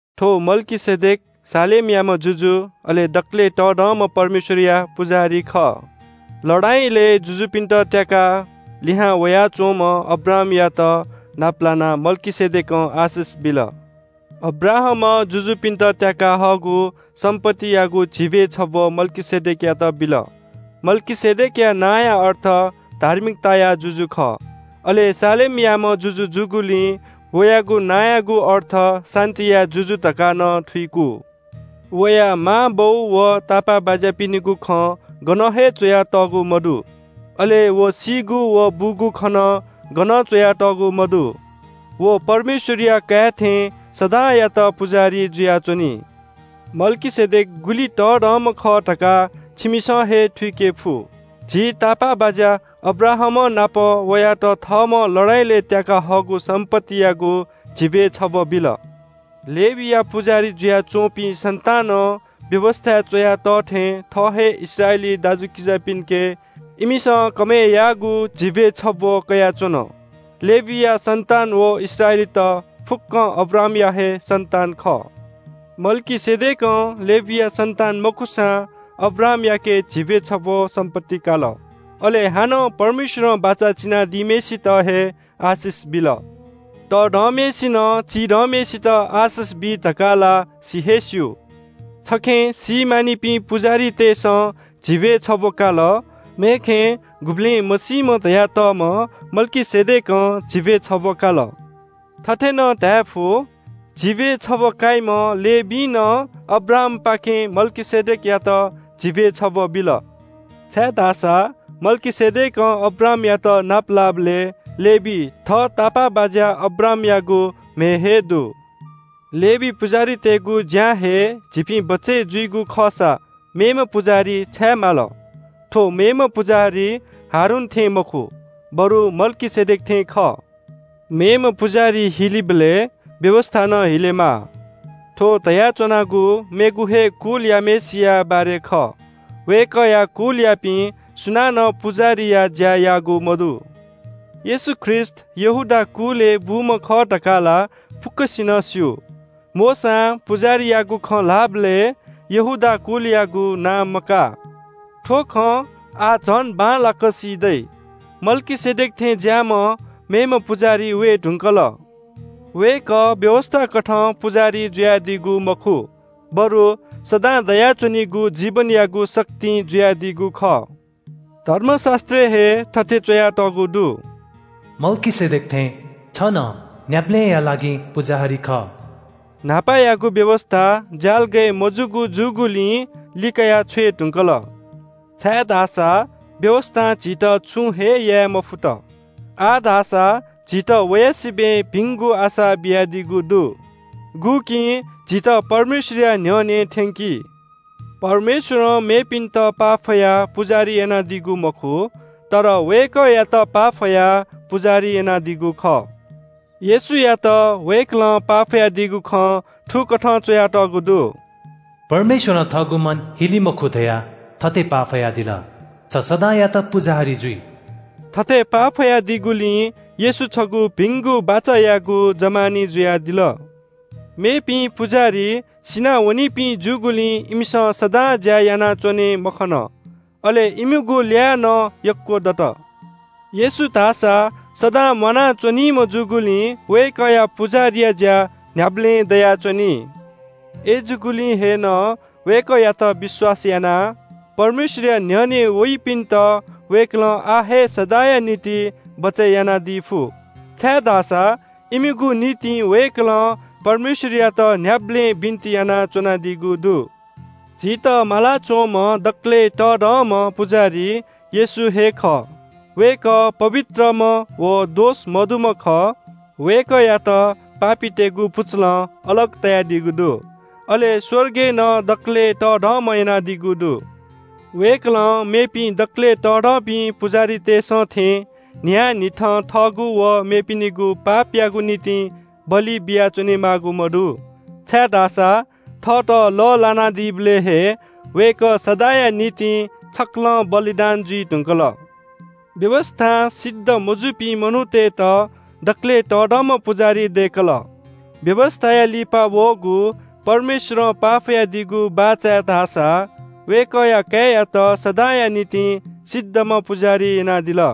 थ्‍व मल्‍कीसेदेक शालेमयाम्‍ह जुजु, अले दकलय् तःधंम्‍ह परमेश्‍वरया पुजाहारी खः। लडाइँलय् जुजुपिन्‍त त्‍याकाः लिहां वयाच्‍वंम्‍ह अब्राहामयात नाप लानाः मल्‍कीसेदेकं आशिष बिल। अब्राहामं जुजुपिन्‍त त्‍याकाः हःगु सम्‍पत्तियागु झिब्‍वय् छब्‍व मल्‍कीसेदेकयात बिल। मल्‍कीसेदेकया नांया अर्थ “धार्मिकताया जुजु” खः, अले शालेमयाम्‍ह जुजु जूगुलिं वयागु नांयागु अर्थ “शान्‍तिया जुजु” धकाः नं थुइकू। वया मांबौ व तापाःबाज्‍यापिनिगु खँ गनं हे च्‍वयातःगु मदु। अले व सीगु व बूगु खँ नं गनं च्‍वयातःगु मदु। व परमेश्‍वरया काय् थें सदांयात पुजाहारी जुयाच्‍वनी। मल्‍कीसेदेक गुलि तःधंम्‍ह खः धकाः छिमिसं हे थुइकेफु। झी तापाःबाज्‍या अब्राहामंनापं वयात थःम्‍हं लडाइँलय् त्‍याकाः हःगु सम्‍पत्तियागु झिब्‍वय् छब्‍व बिल। लेवीया पुजाहारी जुयाच्‍वंपिं सन्‍तानं व्‍यवस्‍थाय् च्‍वया तः थें थः हे इस्राएली दाजुकिजापिन्‍के इमिसं कमय् याःगु झिब्‍वय् छब्‍व कयाच्‍वन। लेवीया सन्‍तान व इस्राएलीत फुक्‍कं अब्राहामया हे सन्‍तान खः। मल्‍कीसेदेकं लेवीया सन्‍तान मखुसां अब्राहामयाके झिब्‍वय् छब्‍व सम्‍पत्ति काल। अले हानं परमेश्‍वरं बाचा चिनादीम्‍हय्‌सित हे आशिष बिल। तःधंम्‍हय्‌सिनं चिधंम्‍हय्‌सित आशिष बी धकाः ला सि हे स्‍यू। छखे सीमानिपिं पुजाहारीतय्‌सं झिब्‍वय् छब्‍व काल, मेखे गुबलें मसीम्‍ह धयातःम्‍ह मल्‍कीसेदेकं झिब्‍वय् छब्‍व काल। थथे नं धायेफु – “झिब्‍वय् छब्‍व काइम्‍ह लेवीं नं अब्राहामपाखें मल्‍कीसेदेकयात झिब्‍वय् छब्‍व बिल।” छाय्‌धाःसा मल्‍कीसेदेकं अब्राहामयात नापलाःबलय् लेवी थः तापाःबाज्‍या अब्राहामयागु म्‍हय् हे दु। लेवी पुजाहारीतय्‌गु ज्‍यां हे झीपिं बचय् जुइगु खःसा मेम्‍ह पुजाहारी छाय् माल? थ्‍व मेम्‍ह पुजाहारी हारून थें मखु, बरु मल्‍कीसेदेक थें खः। मेम्‍ह पुजाहारी हिलीबलय् व्‍यवस्‍था नं हिलेमाः। थ्‍व धयाच्‍वनागु मेगु हे कुलयाम्‍हय्‌सिया बारे खः। वय्‌कःया कुलयापिं सुनानं पुजाहारीया ज्‍या याःगु मदु। येशू ख्रीष्‍ट यहूदा कुलय् बूम्‍ह खः धकाः ला फुक्‍कसिनं स्‍यू। मोशां पुजाहारीयागु खँ ल्‍हाःबलय् यहूदा कुलयागु नां मकाः। थ्‍व खँ आः झन बांलाक सी दइ – मल्‍कीसेदेक थें ज्‍याःम्‍ह मेम्‍ह पुजाहारी वये धुंकल। वय्‌कः व्‍यवस्‍थाकथं पुजाहारी जुयादीगु मखु, बरु सदां दयाच्‍वनीगु जीवनयागु शक्तिं जुयादीगु खः। धर्मशास्‍त्रय् हे थथे च्‍वयातःगु दु – “मल्‍कीसेदेक थें छ नं न्‍ह्याबलेंया लागिं पुजाहारी खः।” न्‍हापायागु व्‍यवस्‍था ज्‍यालगय् मजूगु जूगुलिं लिकया छ्वये धुंकल, छाय्‌धाःसा व्‍यवस्‍थां झीत छुं हे याये मफुत। आः धाःसा झीत वया सिबय् भिंगु आशा बियादीगु दु। गुकिं झीत परमेश्‍वरया न्‍ह्यःने थ्‍यंकी। परमेश्‍वरं मेपिन्‍त पाफयाः पुजाहारी यानादीगु मखु, तर वय्‌कःयात पाफयाः पुजाहारी यानादीगु खः। येशूयात वय्‌कलं पाफयादीगु खँ थुकथं च्‍वयातःगु दु – “परमेश्‍वरं थःगु मन हिले मखु धयाः थथे पाफयादिल – ‘छ सदांयात पुजाहारी जुइ।’” थथे पाफयादीगुलिं येशू छगू भिंगु बाचायागु जमानी जुयादिल। मेपिं पुजाहारी सिनावनीपिं जूगुलिं इमिसं सदां ज्‍या यानाच्‍वने मखन। अले इमिगु ल्‍याः नं यक्‍व दत। येशू धाःसा सदां म्‍वाना च्‍वनीम्‍ह जूगुलिं वय्‌कःया पुजाहारीया ज्‍या न्‍ह्याबलें दयाच्‍वनी। अय्‌जूगुलिं हे नं वय्‌कःयात विश्‍वास यानाः परमेश्‍वरया न्‍ह्यःने वइपिन्‍त वय्‌कलं आः हे सदांया निंतिं बचय् यानादी फु, छाय्‌धाःसा इमिगु निंतिं वय्‌कलं परमेश्‍वरयात न्‍ह्याबलें बिन्‍ति यानाच्‍वनादीगु दु। झीत मालाच्‍वंम्‍ह दकलय् तःधंम्‍ह पुजाहारी येशू हे खः। वय्‌कः पवित्रम्‍ह व दोष मदुम्‍ह खः। वय्‌कःयात पापीतय्‌गु पुचलं अलग तयादीगु दु, अले स्‍वर्गय् नं दकलय् तःधंम्‍ह यानादीगु दु। वय्‌कलं मेपिं दकलय् तःधंपिं पुजाहारीतय्‌सं थें न्‍हियान्‍हिथं थःगु व मेपिनिगु पापयागु निंतिं बलि बियाच्‍वने माःगु मदु, छाय्‌धाःसा थःत लः ल्‍हानादीबलय् हे वय्‌कः सदांया निंतिं छकलं बलिदान जुइ धुंकल। व्‍यवस्‍थां सिद्ध मजूपिं मनूतय्‌त दकलय् तःधंम्‍ह पुजाहारी दय्‌कल। व्‍यवस्‍थाया लिपा वःगु परमेश्‍वरं पाफयादीगु बाचाय् धाःसा वय्‌कःया काय्‌यात सदांया निंतिं सिद्धम्‍ह पुजाहारी यानादिल।